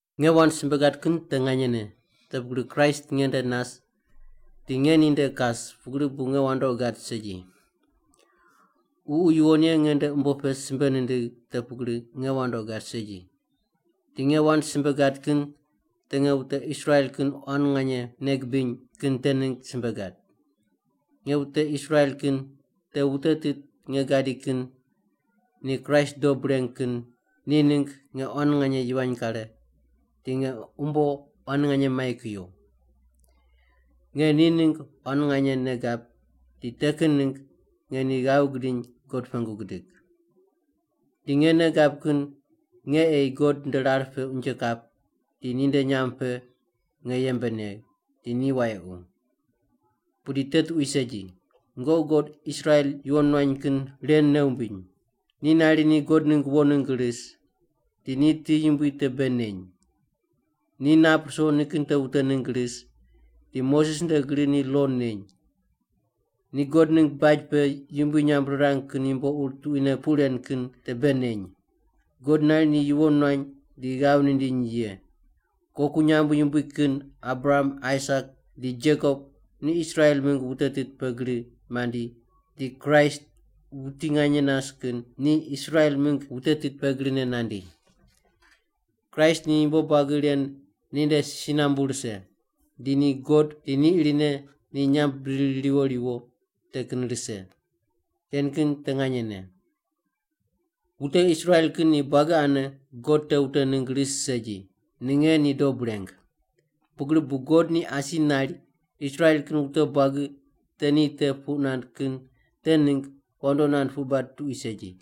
Nge wand simbe gad kin te nganyene te pugri Kraist nge nde nas di nge ninde kas pugri bu nge wandoqi gad segi. Ququ Yuwon Ye nge nde umbo pe simbe nindigh te pugri nge wandoqi gad segi. Di nge wand simbe gad kin te nge wute Israel kin quan nganye nei gibiny kin te ningg simbe gad. Nge wute Israel kin, te wute tit nge gadi kin ni Kraist dob reng kin, ni ningg nge quan nganye yivany kare, di nge umbo quan nganye mai kuyo! Nge ni ningg quan nganye nei gab di te kin ningg nge ni ghav gidiny God pengu gidig. Di nge nei gab kin nge ei God nde rar pe unje kap di ninde nyamb pe nge yembe negh, di ni wayequ. Pudi te tuqui segi. Nungoqi God Israel yuwon nuany kin ren nei wumbiny: Ni nari ni God ningg wo ningg ris, di ni ti yumbui te bei neny. Ni nap ruso nikin te wute ningg ris, di Moses nde gri ni lo neny. Ni God ningg baj pe yumbui nyamb rirang kin yumbo ur tuquine puq ren kin te bei neny. God nari ni yuwon nuany di ghav nindiny ye. Koku nyamb yumbui kin Abraham, Aisak di Jekob ni Israel mingg wute tit pe gri mandi di Kraist, wuti nganye nas kin, ni Israel mingg wute tit pe grine nandi. Kraist ni yumbo buagi ren ni nde si nambu rise, di ni God di ni irine ni nyamb bidiri riwo riwo te kin rise! Ren kin te nganyene. Wute Israel kin ni buagi ane God te wute ningg ris segi, ninge ni dob reng. Pugri bu God ni asi nari Israel kin wute buagi te ni te puq nand kin te ningg wandoqi nand puq bad tuqui segi.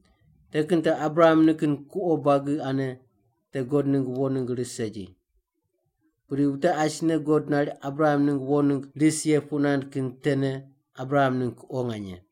Te kin te Abraham nikin kuqo buagi ane te God ningg wo ningg ris segi. Pudi wute asine God nari Abraham ningg wo ningg ris ye puq nand kin tene Abraham ningg kuqo nganye.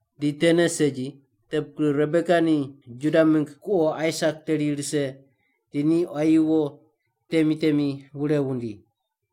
Di tene segi. Te pugri Rebeka ni Juda mingg kuqo Aisak teri rise di ni quayi wo temi temi wure wundi.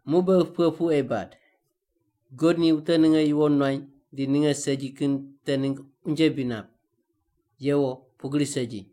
Muq beghi pughe puq ei bad? God ni wute ninge yuwon nuany di ninge segi kin te ningg unje bri nap? Yewo, pugri segi!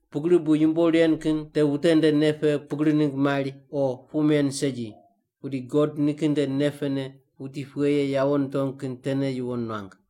Pugri bu yumbo ren kin te wute nde nei pe pugri ningg mari o puq men segi, pudi God nikin nde nei pene wuti pughe ye yawo nitong kin tene yuwon nuang.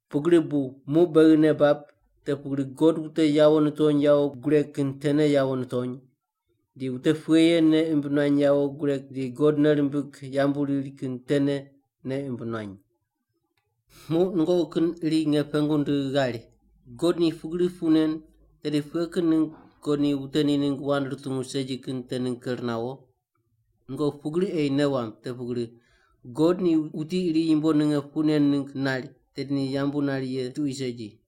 Pugri bu muq beghi nei bab te pugri God wute yawo nitony yawo gureg kin tene yawo nitony, di wute pughe ye nei imb nuany yawo gureg di God nei rimbig yambu riri kin tene nei imb nuany. Muq nungoqi kin iri nge pengu ndigh ghari, “God ni pugri puq nen tedi pughe kin ningg God ni wute ni ningg wand rutungu segi kin te ningg ker nawo? Nungoqi pugri ei nei wamb te pugri, God ni wuti iri yumbo ninge puq nen ningg nari, tedi ni yambu nari ye tuqui segi.”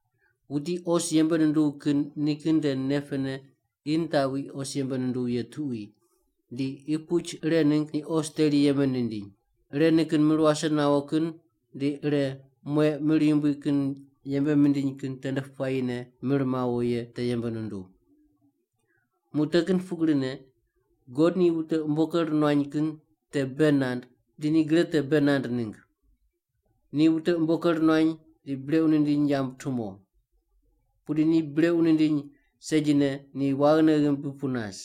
Wuti os yembe nunduw kin nikin nde nei pene qi nitaqwi os yembe nunduw ye tuqui, di qi puch ire ningg ni os teri yembe nindiny. Ire nikin mir wase nawo kin, di ire mueq mir yumbui kin yembe mindiny kin tende puayine mir mawo ye te yembe nunduw. Muq te kin pugrine, God ni wute umbo ker nuany kin te bei nand di ni gre te bei nand ningg. Ni wute umbo ker nuany di brequ nindiny yamb tumo. Pudi ni brequ nindiny segine ni waghine ghimbi pu nas.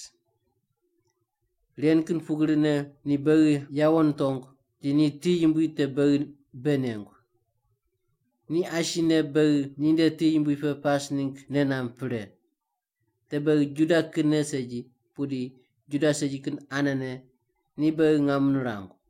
Ren kin pugrine ni beghi yawo nitong di ni ti yumbui te beghi bei nengu. Ni asine beghi ninde ti yumbui pe pas ningg nei namb pre. Te beghi Juda kinne segi, pudi Juda segi kin anene ni beghi ngam nirangu.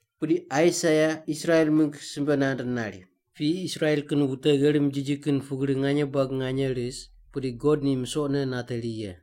Pudi Aisaia Israel mingg simbe nand nari, “Piyi Israel kin wute gherim jiji kin pugri nganye buagi nganye ris, pudi God ni misoqne nateri ye.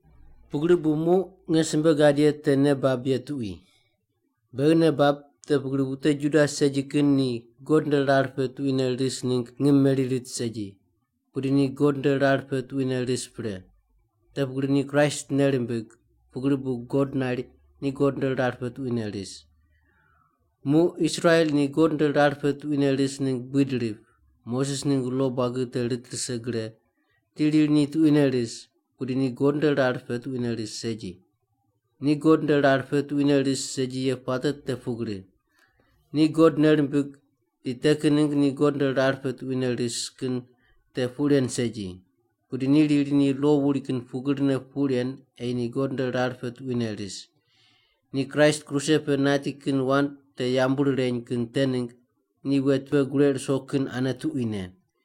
Pugri bu muq nge simbe gad ye te nei bab ye tuqui. Beghi nei bab te pugri wute Juda segi kin ni God nde rar pe tuquine ris ningg ngim meri rit segi, pudi ni God nde rar pe tuquine ris pre. Te pugri ni Kraist nei rimbig, pugri bu God nari ni God nde rar pe tuquine ris. Muq Israel ni God nde rar pe tuquine ris ningg buid rip, Moses ningg lo buagi te rit rise gre di riri ni tuquine ris, pudi ni God nde rar pe tuquine ris segi. Ni God nde rar pe tuquine ris segi ye puate te pugri: Ni God nei rimbig di te kin ningg ni God nde rar pe tuquine ris kin te puq ren segi. Pudi ni riri ni lo wuri kin pugrine pu ren ei ni God nde rar pe tuquine ris. Ni Kraist kruse pe nati kin wand te yambu rireny kin te ningg ni wet pe gureq ruso kin ane tuquine.